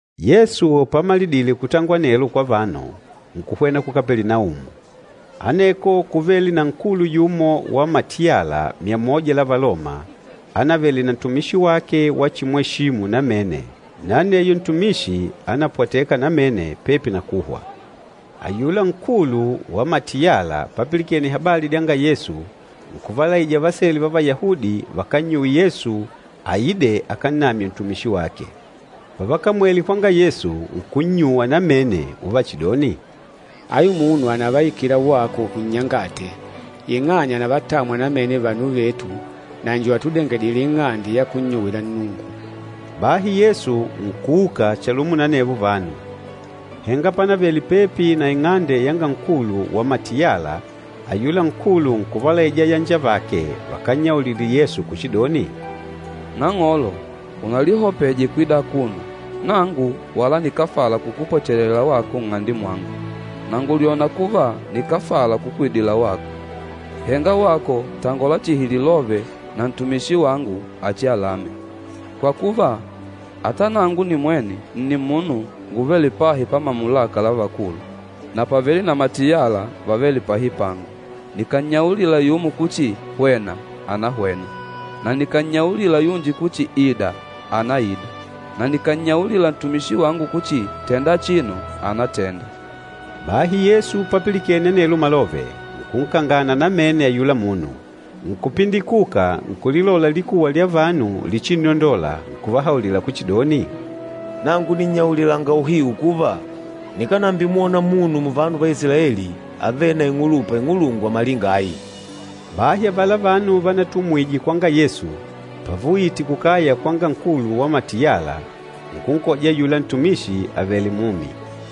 Yesu pamalidile kutangola anelo kwa vanu, nkuhwena ku Kapelinaumu. Aneko kúvele na nkulu yumo wa matiyala myamoja la Valoma, ánavele na ntumishi wake wachimweshimu namene, na aneyo ntumishi ánapwateka namene pepi na kuhwa. Ayula nkulu wa matiyala papilikene habali dyanga Yesu, nkuvalaija vasele va Vayahudi vakannyuwe Yesu aide akannamye ntumishi wake. Pavakamwele kwanga Yesu, nkunnyuwa namene uvachidoni, “Ayu munu ànavaikila wako unnyangate, ing'anya ànavatamwa namene vanu vetu na njo atudengedîle ing'ande ya kunnyuwila Nnungu.” Bahi Yesu nkuuka chalumo na anevo vanu. Henga pánavele pepi na ing'ande yanga nkulu wa matiyala, ayula nkulu nkuvalaija ayanjavake vakannyaulile Yesu kuchidoni, “Nang'olo unalihopeje kwida akuno. Nangu wala nikáfala kukupwechelela wako nng'ande mwangu, na ngùlyona kuva nikáfala kukwidila wako. Henga wako tangola chihi lilove na ntumishi wangu achialame. Kwa kuva, ata nangu nimwene nni munu nguvêle pahi pa mamulaka la vakulu, na pàvele na matiyala vavêle pahi pangu. Nikànnyaulila yumo kuchi, ‘Hwena!,’ ànahwena. Na nikànnyaulila yunji kuchi, ‘Ida!,’ ànaida. Na nikànnyaulila ntumishi wangu kuchi, ‘Tenda achino!,’ ànatenda.” Bahi Yesu papilikene anelo malove, nkunkangana namene ayula munu, nkupindikuka nkulilola likuwa lya vanu lichinnondola nkuvahaulila kuchidoni, “Nangu nìnnyaulilanga uhiu kuva, nikánambimwona munu muvanu va Isilaeli avêle na ing'ulupa ing'ulungwa malinga ayi!” Bahi avala vanu vanatumwije kwanga Yesu, pavauyite kukaya kwanga nkulu wa matiyala, nkunkoja ayula ntumishi avèlè mumi.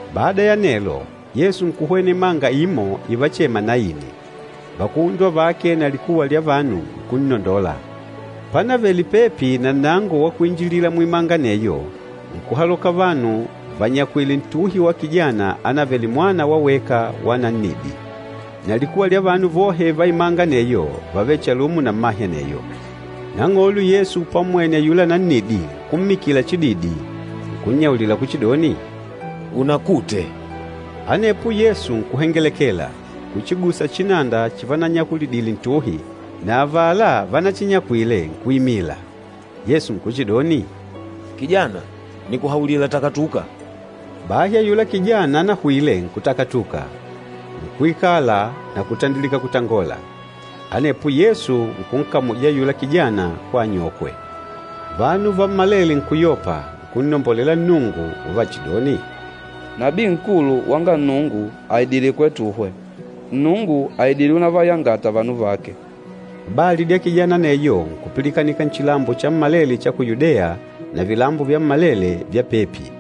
Bada ya anelo, Yesu nkuhwena imanga imo ivachema Naini, vakuhundwa vake na likuwa lya vanu nkunnondola. Pánavele pepi na nnango wa kuinjilila muimanga aneyo, nkuhaloka vanu vanyakwìlè ntuhi wa kijana ánavele mwana wa weka wa nannidi. Na likuwa lya vanu vohe va imanga aneyo vávele chalumo na mmahe aneyo. Nang'olo Yesu pammwene ayula nannidi nkummikila chididi, nkunnyaulila kuchidoni, “Unakute.” Anepo Yesu nkuhengelekela, nkuchigusa chinanda chivanyakulidile ntuhi, na avala vanachinyakwile nkuimila. Yesu nkuchidoni, “Nnemba, nikuhaulila takatuka!” Bahi ayula kijana anahwile nkutakatuka, nkuikala na kutandilika kutangola. Anepo Yesu nkunkamuja ayula kijana kwa anyokwe. Vanu vammalele nkuyopa, nkunnombolela Nnungu, uvachidoni, “Nabii nkulu wanga Nnungu àidile kwetuhwe. Nnungu àidile unavayangata vanu vake.” Habali dya kijana aneyo nkupilikanika nchilambo chammalele cha ku Yudeya, na vilambo vyammalele vya pepi.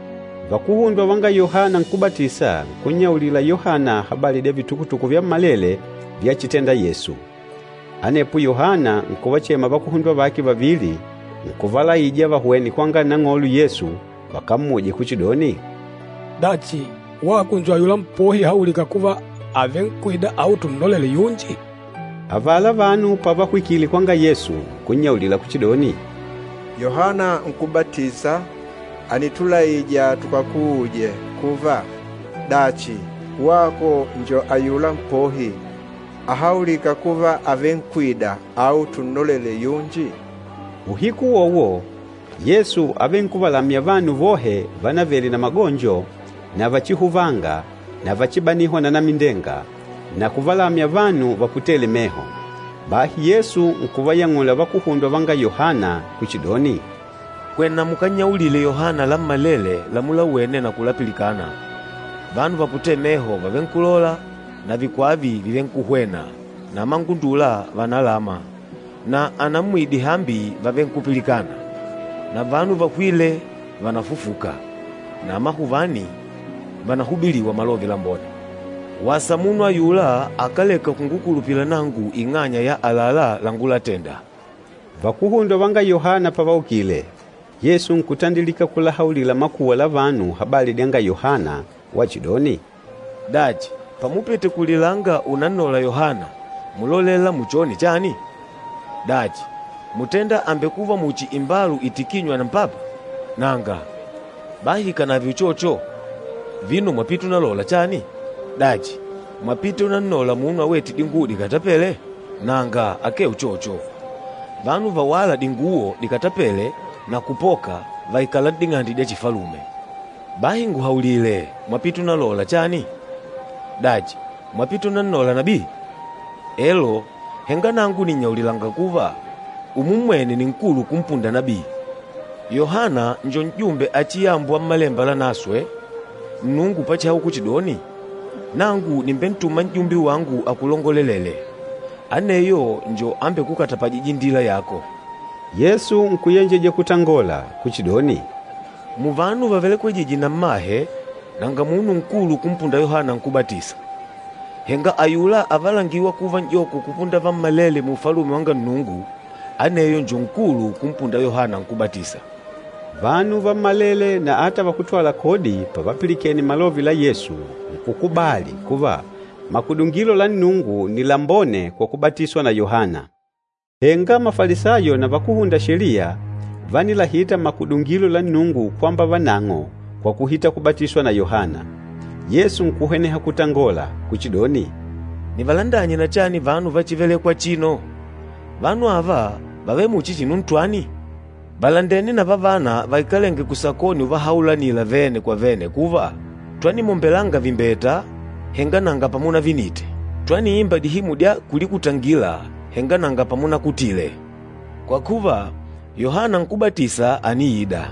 Vakuhundwa vanga Yohana Nkúbatisa nkunnyaulila Yohana habali dya vitukutuku vyammalele vyachitenda Yesu. Anepo Yohana nkuvachema vakuhundwa vake vavili, nkuvalaija vahwene kwanga Nang'olo Yesu vakammuje kuchidoni, “Dachi, wako njo ayula Mpohi ahaulîka kuva àvenkwida au tunnolele yunji?” Avala vanu pavahwikile kwanga Yesu nkunnyaulila kuchidoni, “Yohana Nkúbatisa ànitulaija tukakuuje kuva, ‘Dachi, wako njo ayula Mpohi ahaulîka kuva àvenkwida au tunnolele yunji?’” Uhiku uwowo, Yesu ávenkuvalamya vanu vohe vánavele na magonjo na vachihuvanga na vachibanihwa na anamindenga, na kuvalamya vanu vaputêle meho. Bahi Yesu nkuvayang'ula vakuhundwa vanga Yohana kuchidoni, “Hwena mukannyaulile Yohana lammalele lamulawene na kulapilikana, vanu vaputêle meho vàvenkulola na vikwava vàvenkuhwena na amangundula vànalama na anammwidi hambi vàvenkupilikana na vanu vahwîle vànafufuka na amahuvani vànahubiliwa Malove Lambone. Wasa munu ayula akáleka kungukulupila nangu ing'anya ya àlalá langulatenda!” Vakuhundwa vanga Yohana pavaukile, Yesu nkutandilika kuhaulila makuwa la vanu habali dyanga Yohana wachidoni, “Dachi, pamupite kulilanga unannola Yohana, múlolela muchone chani? Dachi, mútenda àmbekuva muchi imbalu itikînywa na mpapa? Nanga! Bahi ikànave uchocho, vino mwapite unalola chani? Dachi, mwapite unannola munu awête dinguwo dikatapêle? Nanga akee uchocho! Vanu vawâla dinguwo dikatapêle na kupoka, vàikala n'ding'ande dya chifalume. Bahi nguhaulile, mwapite unalola chani? Dachi, mwapite unannola nabii? Elo! Henga nangu nìnnyaulilanga kuva, umummwene ni nkulu kumpunda nabii. Yohana njo n'jumbe achiyambwa Mmalemba Lanaswe, Nnungu pachihaula kuchidoni, ‘Nangu nìmbentuma n'jumbe wangu akulongolelee, aneyo njo ambekukatapajîja indila yako.’” Yesu nkuyenjeja kutangola kuchidoni, “Muvanu vavelekwejîje na mmahe, nanga munu nkulu kumpunda Yohana Nkúbatisa. Henga ayula avalangîwa kuva n'joko kupunda vammalele mu Ufalume wanga Nnungu, aneyo njo nkulu kumpunda Yohana Nkúbatisa.” Vanu vammalele na ata vakútwala kodi pavapilikene malove la Yesu, nkukubali kuva, makudungilo la Nnungu nni lambone kwa kubatiswa na Yohana. Henga Mafalisayo na vakúhunda Sheliya vánilahita makudungilo la Nnungu kwamba vanang'o kwa kuhita kubatiswa na Yohana. Yesu nkuhweneha kutangola kuchidoni, “Nivalandanye na chani vanu va chívelèkwà achino? Vanu ava vàvele muchi chinu ntwani? Vàlandene na vavana vaikalênge kusakoni uvahaulanila vene kwa vene kuva, ‘Twanimwombelanga vimbeta, henga nanga pamunavinite! Twaniimba dihimu dya kulikutangila, henga nanga pamunakutile!’ Kwa kuva, Yohana Nkúbatisa àniida,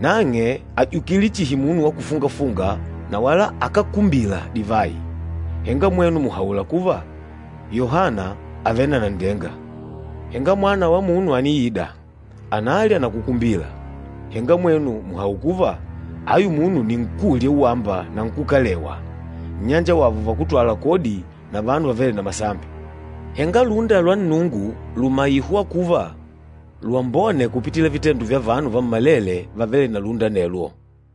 nang'e àjukile chihi munu wa kufunga-funga na wala akákumbila divayi, henga mwenu mùhaula kuva, ‘Yohana àvele na nanndenga!’ Henga Mwana wa Munu àniida, analya na kukumbila, henga mwenu mùhaula kuva, ‘Ayu munu nni nkúlya uwamba na nkúkalewa, nnyanjawavo vakútwala kodi na vanu vavêle na masambi!’ Henga lúnda lwa Nnungu lùmaihwa kuva lwambone kupitila vitendo vya vanu vammalele vavêle na lúnda anelwo.”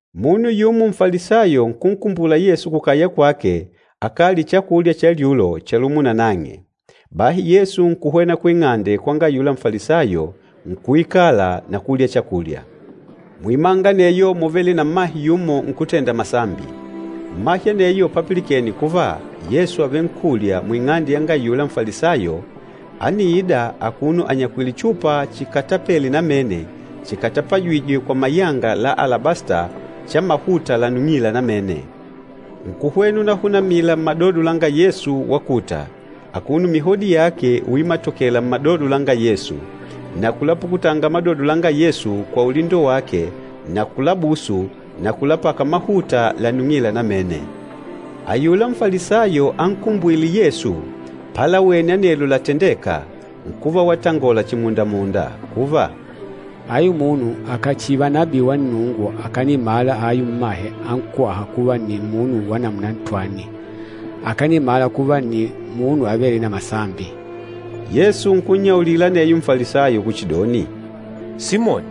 Munu yumo Nfalisayo nkunkumbula Yesu kukaya kwake akalye chakulya cha lyulo chalumo nanang'e. Bahi Yesu nkuhwena kuing'ande kwanga ayula Nfalisayo, nkuikala na kulya chakulya. Muimanga aneyo múvele na mmahe yumo nkútenda masambi. Mmahe aneyo papilikene kuva Yesu àvenkulya muing'ande yanga ayula Nfalisayo, ániida akuno anyakwìlè chupa chikatapele namene chikatapajîjwe kwa mayanga la alabasta cha mahuta lanung'ila namene. Nkuhwena unahunamila mmadodo langa Yesu wakuta, akuno mihodi yake uimatokela mmadodo langa Yesu, na kulapukutanga madodo langa Yesu kwa ulindo wake na kulabusu na kulapaka mahuta lanung'ila namene. Ayula Nfalisayo ankumbwîle Yesu palawene anelo latendêka, nkuva watangola chimunda-munda kuva, “Ayu munu akàchiva nabii wa Nnungu akanimmala ayu mmahe ankwâha kuva nni munu wa namuna ntwani. Akanimala kuva nni munu avêle na masambi.” Yesu nkunnyaulila aneyo Nfalisayo kuchidoni, “Simoni,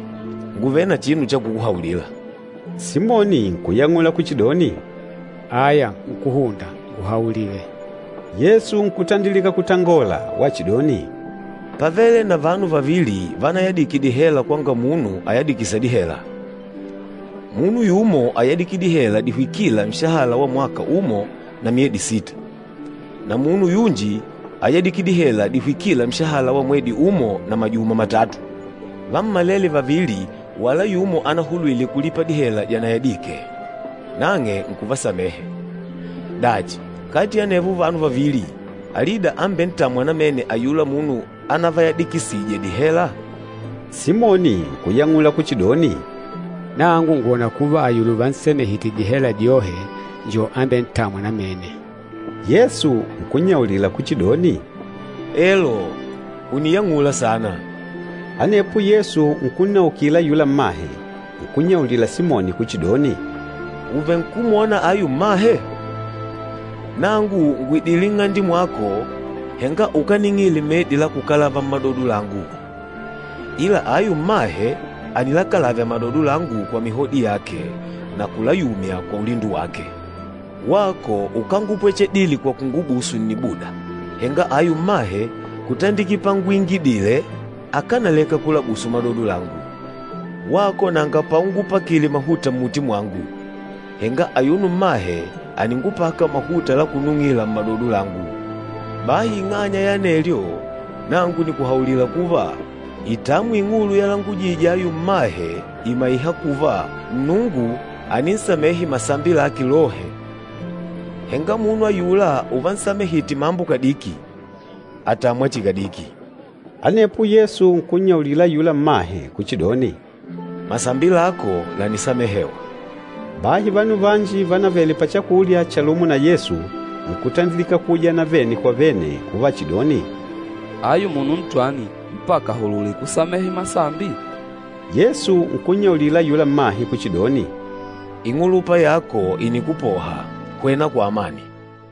ngùvele na chinu cha kukuhaulila.” Simoni nkuyang'ula kuchidoni, “Aya nkúhunda, nguhaulile.” Yesu nkutandilika kutangola wachidoni, “Pávele na vanu vavili vanayadike dihela kwanga munu ayadikîsa dihela. Munu yumo áyadike dihela dihwikîla nshahala wa mwaka umo na myedi sita, na munu yunji áyadike dihela dihwikîla nshahala wa mwedi umo na majuma matatu. Vammalele vavili wala yumo anahulwile kulipa dihela dyanayadike, nang'e nkuvalekelela. Dachi, kati ya anevo vanu vavili, alida ambentâmwa namene ayula munu anavayadikisije dihela?” Simoni nkuyang'ula kuchidoni, “Nangu ngwòna kuva, ayula uvansamehite dihela dyohe njo ambentâmwa namene.” Yesu nkunnyaulila kuchidoni, “Elo, ùniyang'ula saana.” Anepo Yesu nkunnaukila ayula mmahe, nkunnyaulila Simoni kuchidoni, “Ùvenkumwona ayu mmahe? Nangu ngùidile nng'ande mwako, henga ukáning'ile medi la kukalava mmadodo langu, ila ayu mmahe ànilakalavya madodo langu kwa mihodi yake na kulayumya kwa ulindo wake. Wako ukángupwechedile kwa kungubusu nnibuda, henga ayu mmahe, kutandikila panguingidile, akánaleka kulabusu madodo langu. Wako nanga paungupakile mahuta mmuti mwangu, henga ayuno mmahe àningupaka mahuta la kunung'ila mmadodo langu. Bahi ing'anya ya anelyo, nangu nìkuhaulila kuva, itamwi ing'ulu yalangujije ayu mmahe ìmaiha kuva Nnungu àninsamehe masambi lake lohe. Henga munu ayula uvansamehite mambo kadiki àtamwa chihi kadiki.” Anepo Yesu nkunnyaulila ayula mmahe kuchidoni, “Masambi lako lànisamehewa.” Bahi vanu vanji vanavele pachakulya chalumo na Yesu nkutandilika kuujana vene kwa vene uvachidoni, “Ayu munu ntwani mpaka ahulule kusamehe masambi?” Yesu nkunnyaulila ayula mmahe kuchidoni, “Ing'ulupa yako ìnikupoha. Hwena kwa amani.”